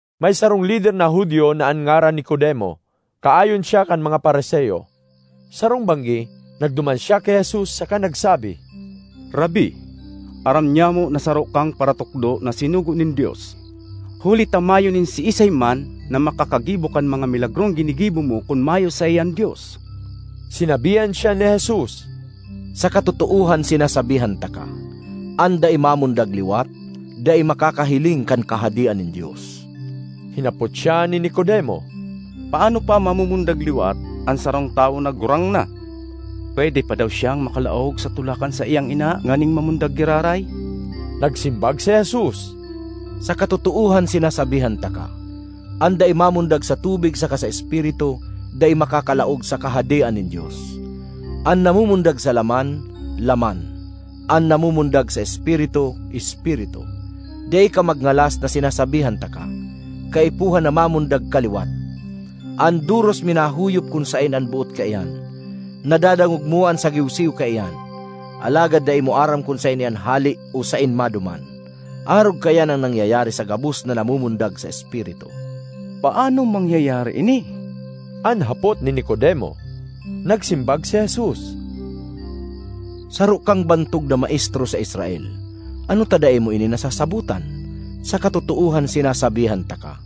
May sarong lider na Judio na an ngaran Nicodemo; kaayon siya kan mga Fariseo. Sarong banggi, nagduman siya ki Jesus saka nagsabi, “Rabbi, aram nyamo na saro kang paratukdo na sinugo nin Dios, huli ta mayo nin siisay man na makakagibo kan mga milagrong ginigibo mo kun mayo saiya an Dios.” Sinabihan siya ni Jesus, “Sa katotoohan sinasabihan taka, an dai mamundag liwat, dai makakahiling kan Kahadean nin Dios.” Hinapot siya ni Nicodemo, “Paano pa mamumundag liwat an sarong tawo na gurang na? Pwede pa daw siyang makalaog sa tulak kan saiyang ina nganing mamundag giraray?” Nagsimbag si Jesus, “Sa katotoohan sinasabihan taka, an dai mamundag sa tubig saka sa Espiritu, dai makakalaog sa Kahadean nin Dios. An namumundag sa laman, laman; an namumundag sa Espiritu, espiritu. Dai ka magngalas na sinasabihan taka, ‘Kaipuhan na mamundag ka liwat.’ An doros minahuyop kun saen an boot kaiyan; nadadangog mo an sagiwsiw kaiyan, alagad dai mo aram kun saen iyan hale o saen maduman. Arog kaiyan an nangyayari sa gabos na namumundag sa Espiritu.” ”Paano mangyayari ini?” an hapot ni Nicodemo. Nagsimbag si Jesus, “Saro kang bantog na maestro sa Israel. Ano ta dai mo ini nasasabotan? Sa katotoohan sinasabihan taka,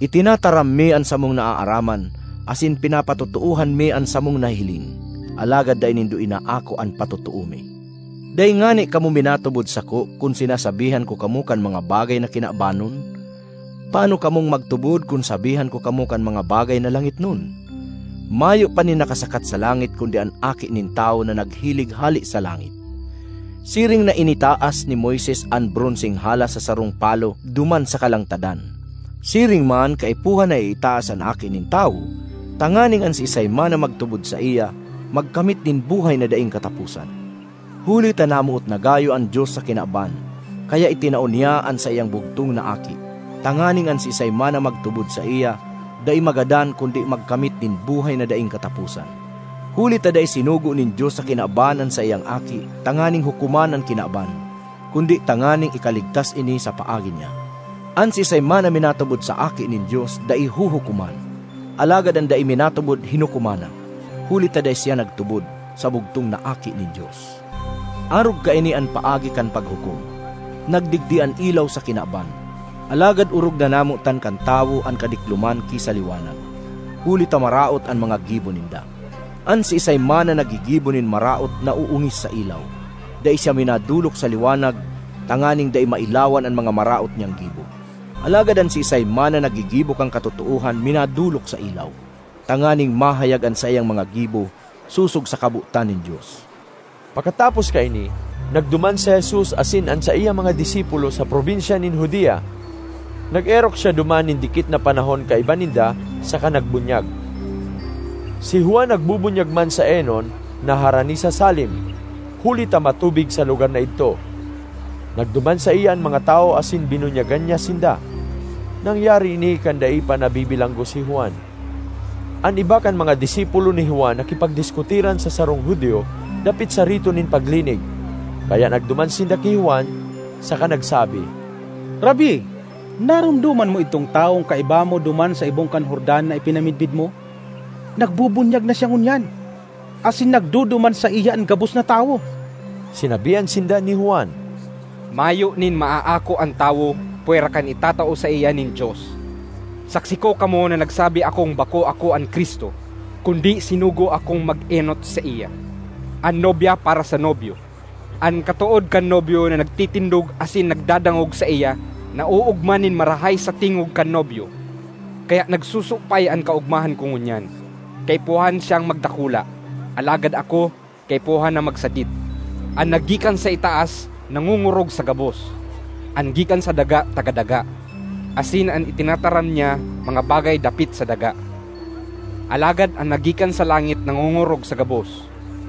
itinataram mi an samong naaaraman asin pinapatotoohan mi an samong nahiling, alagad dai nindo inaako an patotoo mi. Dai ngani kamo minatubod sako kun sinasabihan ko kamo kan mga bagay na kinabanon; paano kamong magtubod kun sabihan ko kamo kan mga bagay na langitnon? Mayo pa nin nakasakat sa langit kundi an Aki nin Tawo na naghilig hale sa langit.” Siring na initaas ni Moises an bronseng halas sa sarong palo duman sa kalangtadan, siring man kaipuhan na iitaas an Aki nin Tawo, tanganing an siisay man na magtubod saiya magkamit nin buhay na daing kataposan. Huli ta namoot na gayo an Dios sa kinaban kaya itinao niya an saiyang bugtong na Aki, tanganing an siisay man na magtubod saiya dai magadan kundi magkamit nin buhay na daing kataposan. Huli ta dai sinugo nin Dios sa kinaban an saiyang Aki tanganing hukoman an kinaban, kundi tanganing ikaligtas ini sa paagi niya. An siisay man na minatubod sa Aki nin Dios dai huhukoman; alagad an dai minatubod hinukoman na, huli ta dai siya nagtubod sa bugtong na Aki nin Dios. Arog kaini an paagi kan paghukom; nagdigdi an ilaw sa kinaban, alagad orog na namotan kan tawo an kadikloman ki sa liwanag, huli ta maraot an mga gibo ninda. An siisay man na naggigibo nin maraot naoongis sa ilaw. Dai siya minadolok sa liwanag tanganing dai mailawan an mga maraot niyang gibo. Alagad an siisay man na naggigibo kan katotoohan minadolok sa ilaw, tanganing mahayag an saiyang mga gibo sosog sa kabotan nin Dios. Pakatapos kaini, nagduman si Jesus asin an saiyang mga disipulo sa probinsya nin Judea. Nag-erok siya duman nin dikit na panahon kaiba ninda, saka nagbunyag. Si Juan nagbubunyag man sa Enon, na harani sa Salim, huli ta matubig sa lugar na idto. Nagduman saiya an mga tawo asin binunyagan niya sinda. (Nangyari ini kan dai pa nabibilanggo si Juan.) An iba kan mga disipulo ni Juan nakipagdiskutiran sa sarong Judio dapit sa rito nin paglinig. Kaya nagduman sinda ki Juan saka nagsabi, “Rabbi, naromdoman mo idtong tawong kaiba mo duman sa ibong kan Jordan na ipinamidbid mo? Nagbubunyag na siya ngunyan, asin nagduduman saiya an gabos na tawo!” Sinabihan sinda ni Juan, “Mayo nin maaako an tawo pwera kan itatao saiya nin Dios. Saksi ko kamo na nagsabi akong bako ako an Cristo, kundi sinugo akong mag-enot saiya. An nobya para sa nobyo; an katood kan nobyo na nagtitindog asin nagdadangog saiya naoogma nin marahay sa tingog kan nobyo. Kaya nagsusupay an kaogmahan ko ngunyan. Kaipuhan siyang magdakula, alagad ako kaipuhan na magsadit.” An naggikan sa itaas nangongorog sa gabos; an gikan sa daga taga daga, asin an itinataram niya mga bagay dapit sa daga. Alagad an naggikan sa langit nangongorog sa gabos.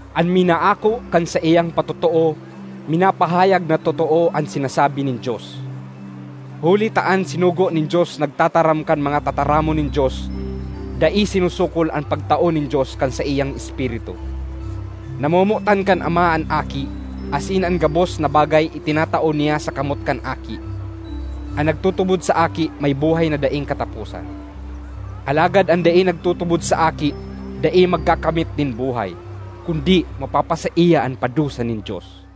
An minaako kan saiyang patotoo minapahayag na totoo an sinasabi nin Dios. Huli ta an sinugo nin Dios nagtataram kan mga tataramon nin Dios; dai sinusukol an pagtao nin Dios kan saiyang Espiritu. Namomotan kan Ama an Aki, asin an gabos na bagay itinatao niya sa kamot kan Aki. An nagtutubod sa Aki may buhay na daing kataposan; alagad an dai nagtutubod sa Aki dai magkakamit nin buhay, kundi mapapasaiya an padusa nin Dios.